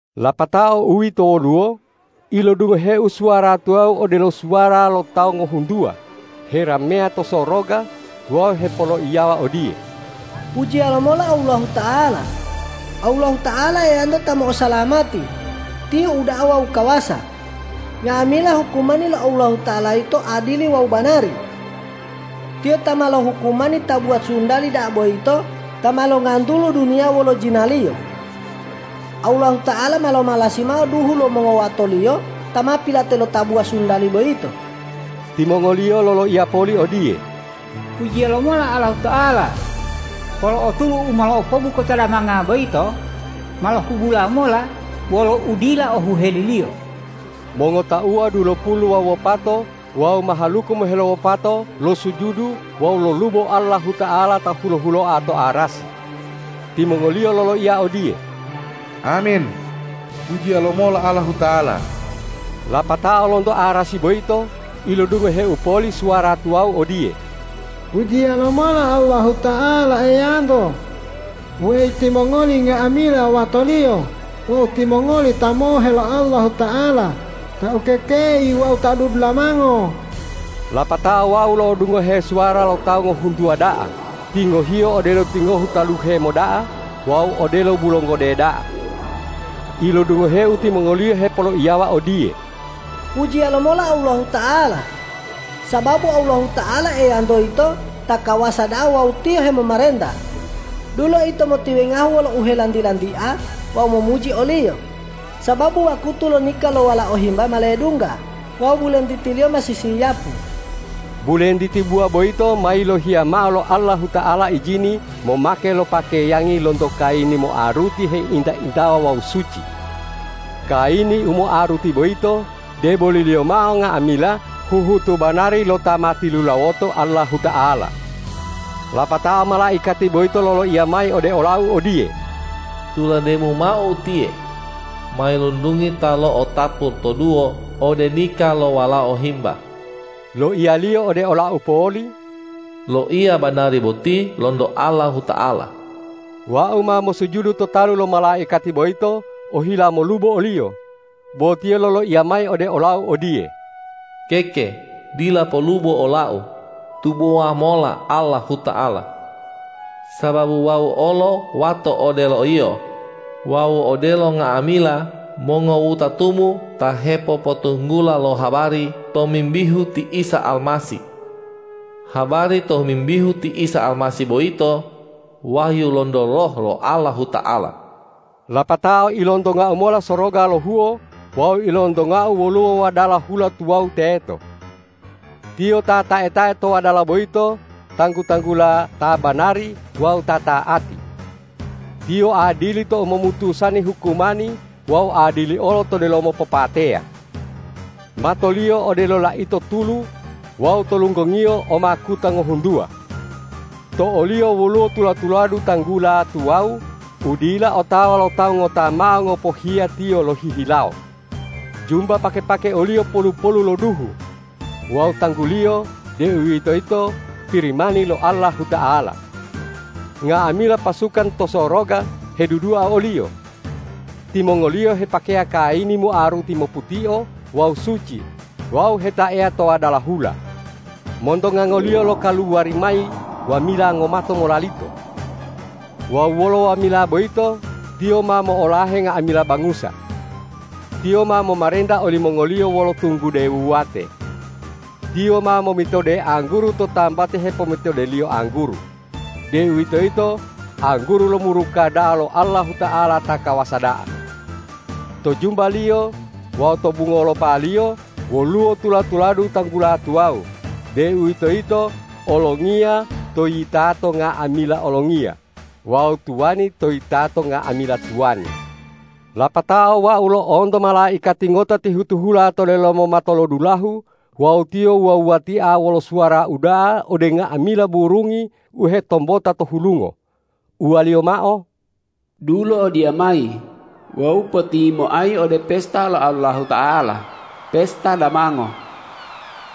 Lapatao uwito woluwo, ilodungoheu suwara tuwawu odelo suwara lo tawu ngohuntuwa herameya to soroga wawu hepoloiyawa odiye,”Pujiya lomola Allahuta'ala! Allahuta'ala Eyanto ta mo'osalamati, Tiyo uda'a wawu kawasa! Nga'amila hukumani lo Allahuta'ala yito adili wawu banari! Tiyo ta ma lohukumani tabuwa sundali da'a boyito ta ma longantulu duniya wolo jinaliyo. Allahuta'ala ma lomalasi mao duhu lo mongowato-Liyo ta ma pilate lo tabuwa sundali boyito.” Timongoliyo loloiya poli odiye,”Pujiya lomola Allahuta'ala! Polo'o tulu u ma lo'opobu kota damanga boyito ma lohubula mola wolo udila ohuheliliyo.” Mongotauwa dulopulu wawu wopato wawu mahaluku moheluwopato losujudu wawu lolubo Allahuta'ala ta hulo-huloa to arasi. Timongoliyo loloiya odiye,”Amin! Pujiya lomola Allahuta'ala!” Lapatao lonto arasi boyito ilodungoheu poli suwara tuwawu odiye,”Pujiya lomola Allahuta'ala Eyanto, weyi timongoli nga'amila wato-Liyo wawu timongoli ta mohe lo Allahuta'ala, ta ukekei wawu ta ududulamango!” Lapatao wau lo'odungohu suwara lo tawu ngohuntuwa da'a, tingohiyo odelo tingohu taluhe moda'a wawu odelo bulonggode da'a. Ilodungoheu timongoliyo hepoloiyawa odiye,”Pujiya lomola Allahuta'ala! Sababu Allahuta'ala Eyanto yito ta kawasa da'a wawu Tiyo hemomarenta! Dulo ito motiwengahu wolo uhelanti-lantia wawu momuji o-Liyo, sababu wakutu lo nika lo Walao Himba ma ledungga wawu bulentiti-Liyo ma sisiyapu. Bulentiti buwa boyito ma yilohiya mao lo Allahuta'ala ijini momake lo pakeyangi lonto kayini moaruti heinta-intawa wawu suci.” Kayini u moaruti boyito, deboliliyo mao nga'amila huhutu banari lo ta ma tilulawoto Allahuta'ala. Lapatao malaikati boyito loloiya mayi ode olau odiye,”Tulademu mao utiye: Mailuntungi ta lo'otapu toduwo ode nika lo Walao Himba.” Loiyaliyo ode olau poli,”Loiya banari boti lonto Allahuta'ala.” Wau ma mosujudu to talu lo malaikati boyito ohila molubo oliyo, bo tiyo loloiya mayi ode olau odiye,”Keke, dila polubo olau; tubowa mola Allahuta'ala! Sababu wau olo wato odelo yio wawu odelo nga'amila mongowutatumu ta hepopotunggula lo habari tomimbihu ti Isa Almasih. Habari tomimbihu ti Isa Almasih boyito wahyu lonto Roh lo Allahuta'ala.” Lapatao ilontongau mola soroga lohuo wawu ilontongau woluwo wadala hula tuwawu teto. Tiyo ta tae-tae to wadala boyito tanggu-tanggula Ta banari wawu Ta ta'ati. Tiyo adili tou momutusani hukumani wawu adili olo to delomo popateya. Mato-Liyo odelo laito tulu wawu to lunggong-Iyo o makuta ngohuntuwa. To o-Liyo woluwo tula-tuladu tanggula tuwawu u dila otawa lo tawu ngota mao ngopohiya Tiyo lohihilawo. Jumba pake-pake o-Liyo polu-polu lo duhu wawu tanggu-Liyo, deuwitoyito Pirimani lo Allahuta'ala. Nga'amila pasukan to soroga hedudua o-Liyo. Timongoliyo hepakeya kayini moaruti moputio wawu suci wawu hetaeya to wadala hula. Monto ngango-Liyo lokaluwari mayi wamila ngomato molalito. Wawu wolo wamila boyito Tiyo ma mo'olahe nga'amila bangusa. Tiyo ma momarenta olimongoliyo wolo tunggude wuwate. Tiyo ma momitode angguru to tambati hepomitodeliyo angguru, deuwitoyito angguru lo muruka da'a lo Allahuta'ala ta kawasa da'a. To jumba-Liyo wawu to bungolopa-Liyo woluwo tula-tuladu tanggula tuwawu, deuwitoyito Olongiya to yitato nga'amila olongiya wawu Tuwani to yitato nga'amila tuwani. Lapatao wau lo'onto malaikati ngota tihu-tihula to delomo matolodulahu wawu tiyo wuwa-wuwatia wolo suwara uda'a ode nga'amila burungi u hetombota to hulungo, uwaliyo mao,”Dulo odiyamayi wawu potiyimoayi ode pesta lo Allahuta'ala, pesta damango.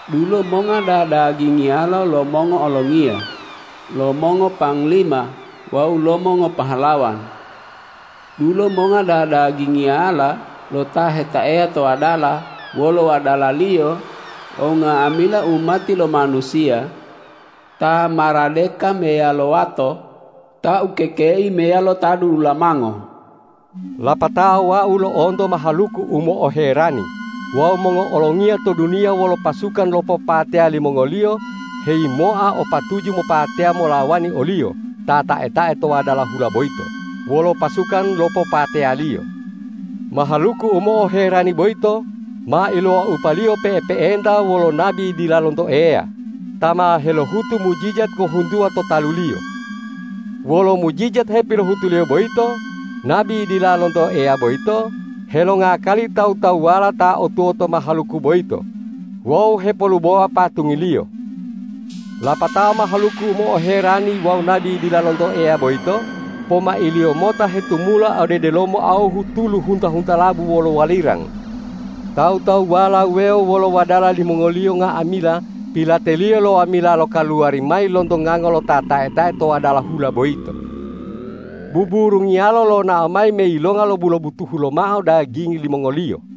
Dulo monga dadagingiyala lo mongo'olongiya, lo mongopanglima wawu lo mongopahlawan! Dulo monga da-dagingiyala lo ta hetaeya to wadala wolo wadalaliyo wawu nga'amila umati lo manusiya, ta maradeka meyalo wato, ta ukekei meyalo ta dudulamango.” Lapatao wau lo'onto mahaluku u mo'oherani wawu mongo'olongiya to duniya wolo pasukan lo popateya limongoliyo heyimoa o patuju mopateya molawani o-Liyo ta tae-tae to wadala hula boyito wolo pasukan lo popateya-Liyo. Mahaluku u mo'oherani boyito ma ilowaupaliyo pe'epe'enta wolo nabi dila lonto Eya, ta ma helohutu mujijat ngohuntuwa to taluliyo. Wolo mujijat hepilohutuliyo boyito nabi dila lonto Eya boyito helongakali tawu-tawuwala ta o tuwoto mahaluku boyito wawu hepolubowa patungliyo. Lapatao mahaluku u mo'oherani wawu nabi dila lonto Eya boyito pomailiyo mota hetumula ode delomo awuhu tulu hunta-huntalabu wolo walirang. Tawu-tawuwala wuwewo wolo wadala limongoliyo nga'amila pilateliyo lo wamila lokaluwari mayi lonto ngango lo Ta tae-tae to wadala hula boyito. Buburungiyalo lonao mayi me yilonga lobu-lobutuhu lomao dagingi limongoliyo.